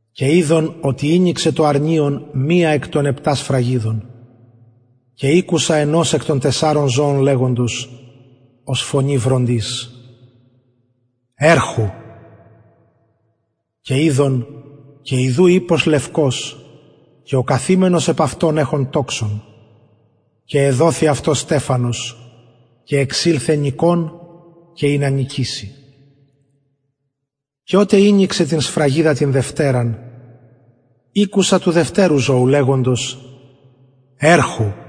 και ειδον οτι ηνοιξεν το αρνιον μιαν εκ των επτα σφραγιδων και ηκουσα ενος εκ των τεσσαρων ζωων λεγοντος ως φωνη βροντης ερχου και ιδε και ιδου ιππος λευκος και ο καθημενος επ αυτον εχων τοξον και εδοθη αυτω στεφανος και εξηλθεν νικων και ινα νικηση και οτε ηνοιξεν την δευτεραν σφραγιδα ηκουσα του δευτερου ζωου λεγοντος ερχου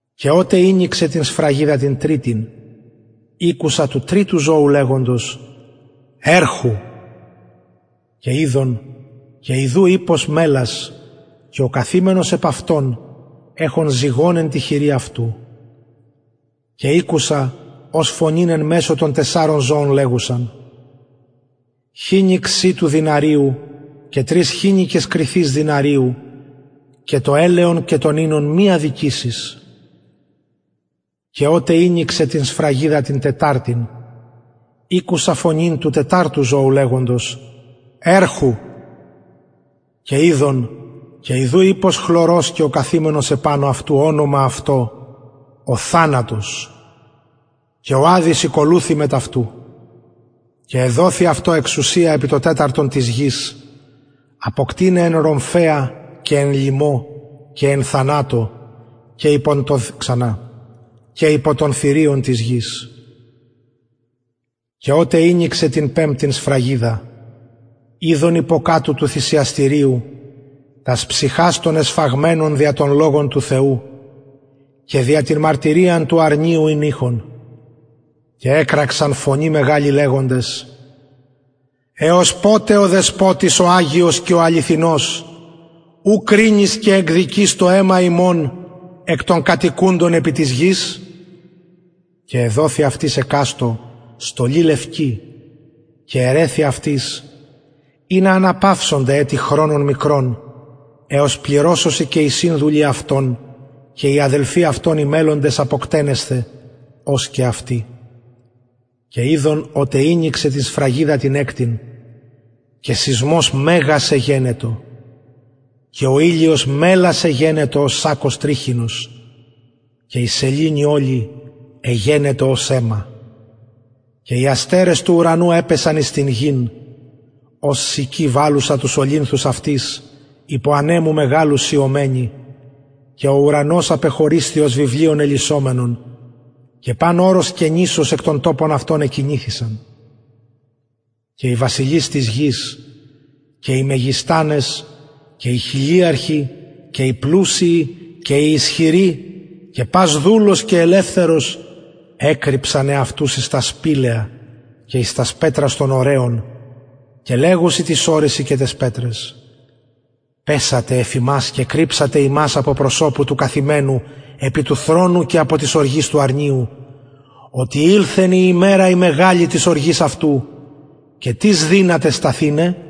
και οτε ηνοιξεν την σφραγιδα την τριτην ηκουσα του τριτου ζωου λεγοντος ερχου και ιδε και ιδου ιππος μελας και ο καθημενος επ αυτον εχων ζυγον εν τη χειρι αυτου και ηκουσα φωνην εν μεσω των τεσσαρων ζωων λεγουσαν χοινιξ σιτου δηναριου και τρεις χοινικες κριθης δηναριου και το ελαιον και τον οινον μη αδικησης και οτε ηνοιξεν την σφραγιδα την τεταρτην ηκουσα του τεταρτου ζωου λεγοντος ερχου και ιδε και ιδου ιππος χλωρος και ο καθημενος επανω αυτου ονομα αυτω ο θανατος και ο αδης ηκολουθει αυτω και εδοθη αυτω εξουσια επι το τεταρτον της γης αποκτειναι εν ρομφαια και εν λιμω και εν θανατω και υπο των θηριων της γης και οτε ηνοιξεν την πεμπτην σφραγιδα ειδον υποκατω του θυσιαστηριου τας ψυχας των εσφαγμενων δια τον λογον του θεου και δια την μαρτυριαν του αρνιου ην ειχον και εκραξαν φωνη μεγαλη λεγοντες εως ποτε ο δεσποτης ο αγιος και αληθινος ου κρινεις και εκδικεις το αιμα ημων εκ των κατοικουντων επι της γης και εδοθη αυτοις εκαστω στολη λευκη και ερρεθη αυτοις ινα αναπαυσωνται ετι χρονον εως πληρωσωσιν και οι συνδουλοι αυτων και οι αδελφοι αυτων και οι μελλοντες αποκτενεσθαι ως και αυτοι και ειδον οτε ηνοιξεν την σφραγιδα την εκτην και σεισμος μεγας εγενετο και ο ηλιος μελας εγενετο ως σακκος τριχινος και η σεληνη ολη εγενετο ως αιμα και οι αστερες του ουρανου επεσον εις την γην ως συκη βαλουσα τους ολυνθους αυτης υπο ανεμου μεγαλου σειομενη και ο ουρανος απεχωρισθη ως βιβλιον ελισσομενον και παν ορος και νησος εκ των τοπων αυτων εκινηθησαν και οι βασιλεις της γης και οι μεγιστανες και οι χιλιαρχοι και οι πλουσιοι και οι ισχυροι και πας δουλος και ελευθερος εκρυψαν εαυτους εις τα σπηλαια και εις τας πετρας των ορεων και λεγουσιν τοις ορεσιν και ταις πετραις πεσετε εφ ημας και κρυψατε ημας απο προσωπου του καθημενου επι του θρονου και απο της οργης του αρνιου οτι ηλθεν η ημερα η μεγαλη της οργης αυτου και τις δυναται σταθηναι